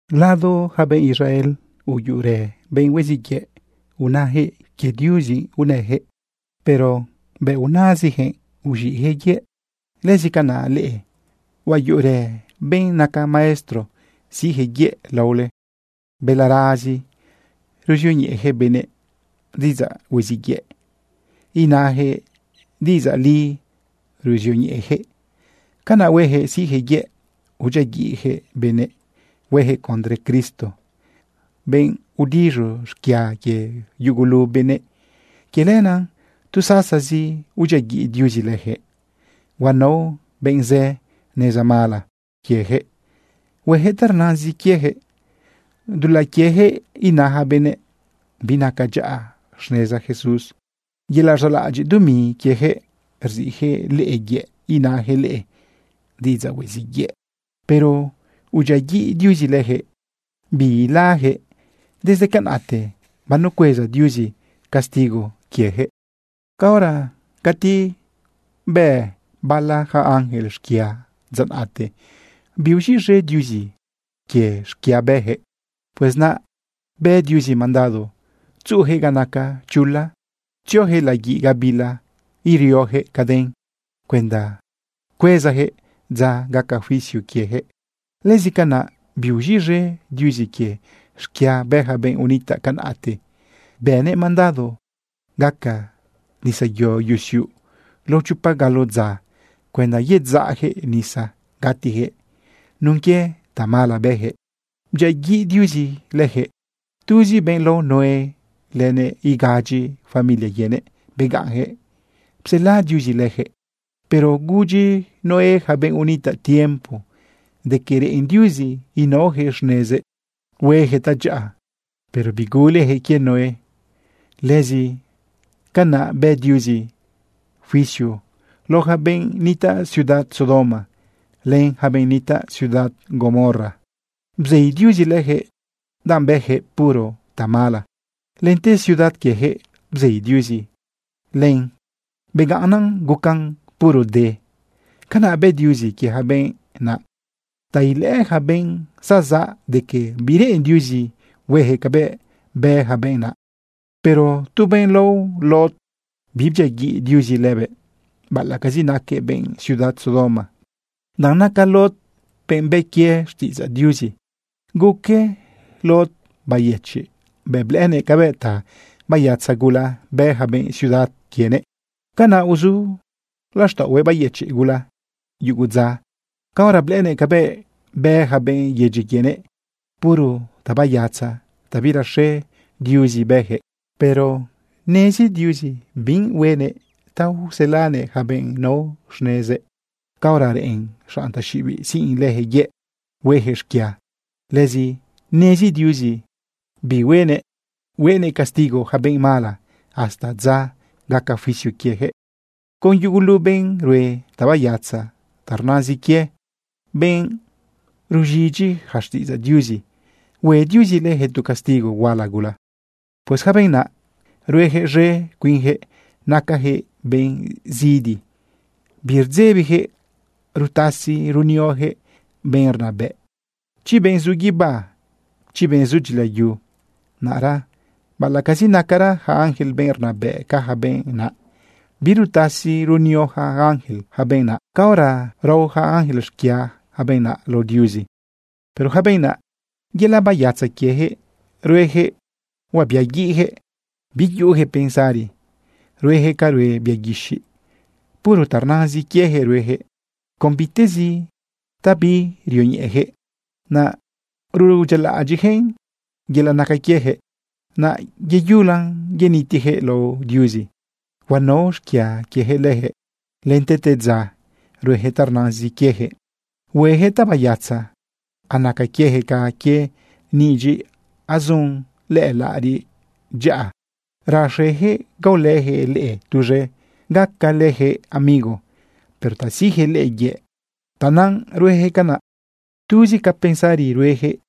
Lao ja benꞌ Israel, uyuꞌurë benꞌ hueziꞌ yëꞌ. Unajëꞌ quie Diuzi najëꞌ, pero bëꞌ nazijëꞌ uz̃iꞌjëꞌ yëꞌ. Lëzi canaꞌ leꞌe, huayuꞌurë benꞌ naca maestro siꞌjëꞌ yëꞌ laole. Balarazi ruzioñeꞌejëꞌ benëꞌ diꞌidzaꞌ huiziꞌ yëꞌ, inajëꞌ diꞌidzaꞌ li ruzioñeꞌejëꞌ. Canaꞌ huejëꞌ siꞌjëꞌ yëꞌ udyiaguiꞌjëꞌ benëꞌ huejëꞌ condre Cristo, benꞌ udiz̃u xquia quie yugulu benëꞌ. Quie lenaꞌ tu sasazi udyiaguiꞌ Diuzi lëjëꞌ. Huanao benꞌ zë neza mala quiejëꞌ huejëꞌ ta rnazin quiejëꞌ. Dulaꞌ quiejëꞌ ina yaca benëꞌ binaca dyaꞌa xneza Jesús. Yelaꞌ rzaꞌlaꞌadyiꞌ dumi quiejëꞌ rziꞌjëꞌ leꞌe yëꞌ inajëꞌ leꞌe diꞌidzaꞌ hueziꞌ yëꞌ. Pero udyiaguiꞌ Diuzi lëjëꞌ, biilajëꞌ. Desde canaꞌte banucueza Diuzi castigo quiejëꞌ. Caora cati bë bala ja ángel xquia dza naꞌte, biuz̃iꞌz̃e Diuzi quie xquia bëjëꞌ. Pues naꞌ bë Diuzi mandado tzuꞌujëꞌ ga naca chula tziojëꞌ laguiꞌ gabila iriojëꞌ caden cuenda cuezajëꞌ dza gaca juicio quiejëꞌ. Lëzi canaꞌ biuz̃iꞌz̃e Diuzi quie xquia bë yaca benꞌ unitaꞌ canaꞌte. Bënëꞌ mandado gaca nisayo yusiuꞌ lao chopa galo dza cuenda yedzaꞌjëꞌ nisa gatijëꞌ. Nun quie tamala bëjëꞌ, bdyiaguiꞌ Diuzi lëjëꞌ. Tuzi benꞌ lao Noé lënëꞌ igadyi familia quienëꞌ begaꞌnjëꞌ psela Diuzi lëjëꞌ. Pero gudyi Noé ja benꞌ unitaꞌ tiempo de quie reꞌen Diuzi inaojëꞌ xnezëꞌ huejëꞌ tadyaꞌa, pero bigulejëꞌ quie Noé. Lëzi canaꞌ bë Diuzi juicio lao yaca benꞌ nitaꞌ ciudad Sodoma len yaca benꞌ nitaꞌ ciudad Gomorra. Bzei Diuzi lëjëꞌ, danꞌ bëjëꞌ puro tamala. Lente ciudad quiejëꞌ bzei Diuzi len begaꞌnnan gucan puro de. Canaꞌ bë Diuzi quie ja benꞌ naꞌ ta ilëꞌë ja benꞌ zazaꞌ de que bireꞌen Diuzi huejëꞌ cabëꞌ bë ja benꞌ naꞌ. Pero tu benꞌ lao Lot, bibdyiaguiꞌ Diuzi lëbëꞌ, baꞌalaꞌcazi naquëꞌ benꞌ ciudad Sodoma, danꞌ naca Lot benꞌ bë quie xtiꞌidzaꞌ Diuzi. Guque Lot bayëchiꞌ bëꞌ blëꞌënëꞌ cabëꞌ ta bayatza gula bë ja benꞌ ciudad quienëꞌ. Canaꞌ uzu laxtaꞌohuëꞌ bayëchiꞌ gula yugu dza caora blëꞌënëꞌ cabëꞌ bë ja benꞌ yedyi quienëꞌ. Puro tabayatza ta biraxe Diuzi bëjëꞌ. Pero nezi Diuzi bi huenëꞌ ta uselanëꞌ yaca benꞌ nao xnezëꞌ caora reꞌen xanꞌ taxiꞌibiꞌ siꞌn lëjëꞌ yëꞌ huejëꞌ xquia. Lëzi nezi Diuzi bi huenëꞌ huenëꞌ castigo yaca benꞌ mala hasta dza gaca juicio quiejëꞌ. Con yugulu benꞌ rue tabayatza ta rnazin quie, benꞌ ruz̃idyi ja xtiꞌidzaꞌ Diuzi, hue Diuzi lëjëꞌ tu castigo huala gula. Pues yaca benꞌ naꞌ ruejëꞌ z̃e cuinjëꞌ, nacajëꞌ benꞌ zidi, birdzebijëꞌ rutasi runiojëꞌ benꞌ rnabëꞌ, chi benꞌ zu guibá, chi benꞌ zu dyilayu. Naꞌra baꞌalaꞌcazi nacara yaca ángel benꞌ rnabëꞌ ca yaca benꞌ naꞌ, birutasi runio yaca ángel yaca benꞌ naꞌ caora rao yaca ángel xquia yaca benꞌ naꞌ lao Diuzi. Pero yaca benꞌ naꞌ, yelaꞌ bayatza quiejëꞌ ruejëꞌ huabiaguiꞌjëꞌ. Biyuꞌujëꞌ pensari. Ruejëꞌ ca rue bia guixiꞌ. Puro ta rnazin quiejëꞌ ruejëꞌ. Con bitezi ta birioñeꞌejëꞌ, naꞌ rudyialaꞌadyiꞌjëꞌn. Yelaꞌ naca quiejëꞌ, naꞌ yeyula yenitijëꞌ lao Diuzi. Huanao xquia quiejëꞌ lëjëꞌ. Lente tedza ruejëꞌ ta rnazin quiejëꞌ huejëꞌ tabayatza. Anaca quiejëꞌ ca quie nidyiꞌ azun lëꞌë laꞌariꞌ dyaꞌa. Raxejëꞌ gaolëjëꞌ leꞌe tuz̃e gacalejëꞌ amigo, pero ta siꞌjëꞌ leꞌe yëꞌ, tanaꞌ ruejëꞌ canaꞌ. Tuzi ca pensari ruejëꞌ,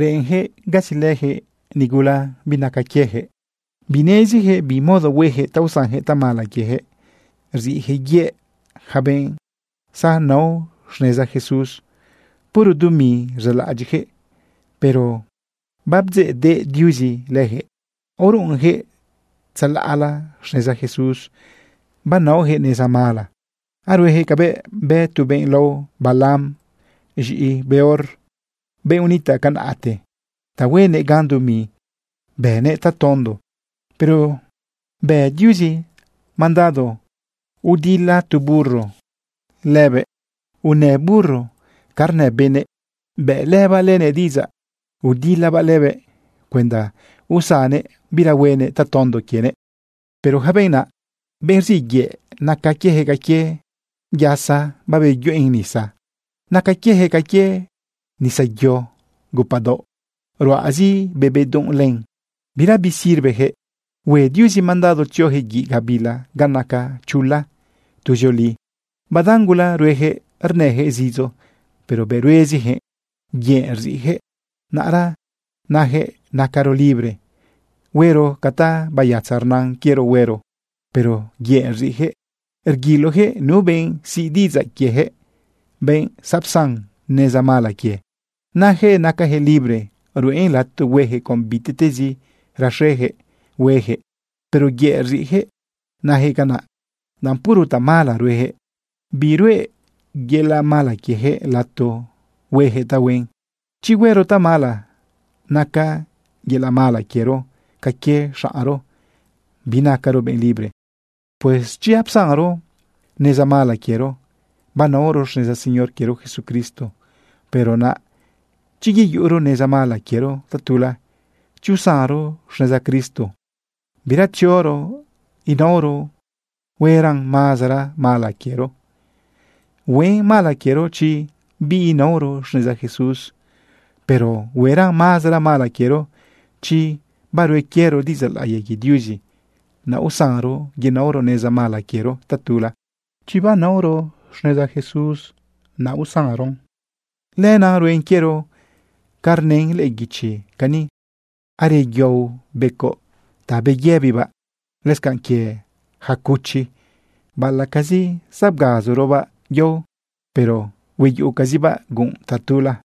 reꞌenjëꞌ gasilëjëꞌ nigula binaca quiejëꞌ. Binezijëꞌ bi modo huejëꞌ ta usanjëꞌ tamala quiejëꞌ. Rziꞌjëꞌ yëꞌ yaca benꞌ zaonao xneza Jesús. Puro dumi rzaꞌlaꞌadyiꞌjëꞌ. Pero babdzeꞌdeꞌ Diuzi lëjëꞌ. Aoruꞌunjëꞌ tzalaꞌla xneza Jesús, banaojëꞌ neza mala. Aruejëꞌ cabëꞌ bë tu benꞌ lao Balaam, z̃iꞌi Beor, benꞌ unitaꞌ canaꞌte. Ta huenëꞌ gan dumi bënëꞌ tatondo. Pero bë Diuzi mandado udila tu burro lëbëꞌ. Unë burro ca rnë benëꞌ. Bëꞌlëbaꞌ lënëꞌ diꞌidzaꞌ udilabaꞌ lëbëꞌ cuenda usannëꞌ bira huenëꞌ tatondo quienëꞌ. Pero yaca benꞌ naꞌ, benꞌ rziꞌ yëꞌ, naca quiejëꞌ ca quie yasa babeyuꞌen nisa. Naca quiejëꞌ ca quie nisayo gupaꞌdaoꞌ ruꞌazi be bedunꞌ len, bira bisirvejëꞌ. Hue Diuzi mandado tziojëꞌ guiꞌ gabila ga naca chula tuzioli. Badan gula ruejëꞌ rnëjëꞌ zidzo, pero bëꞌ ruezijëꞌ, yëꞌ rziꞌjëꞌ. Naꞌra najëꞌ nacaro libre huero ca tabayatza rnan quiero huero, pero yëꞌ rziꞌjëꞌ. Rguilojëꞌ nu benꞌ siꞌ diꞌidzaꞌ quiejëꞌ, benꞌ zapsan neza mala quie. Najëꞌ nacajëꞌ libre ruꞌen lato huejëꞌ con bitiꞌtezi raxejëꞌ huejëꞌ, pero yëꞌ rziꞌjëꞌ najëꞌ canaꞌ, danꞌ puro tamala ruejëꞌ. Biruꞌe yelaꞌ mala quiejëꞌ lato huejëꞌ tahuen. Chi huero tamala, naca yelaꞌ mala quiero ca quie xaꞌnro, binacaro benꞌ libre. Pues chi apsanro neza mala quiero banaoro xneza Señor quiero Jesucristo, pero naꞌ chi yeyuꞌuro neza mala quiero tatula, chi usanro xneza Cristo bira tzioro inaoron, hueran mazara mala quiero. Huen mala quiero chi biinaoro xneza Jesús, pero hueran mazara mala quiero chi barue quiero diꞌidzaꞌ laꞌiya quie Diuzi, naꞌ usanron yenaoro neza mala quiero tatula. Chi banaoro xneza Jesús, naꞌ usanron, lenaꞌ ruen quiero ca rnën lëꞌë guichi cani: “Areyao becoꞌ ta babeyëbibaꞌ. Lëscanꞌ quie yaca cuchi, baꞌalaꞌcazi zabgazorobaꞌ yao, pero hueyuꞌucazibaꞌ gunꞌ tatula.”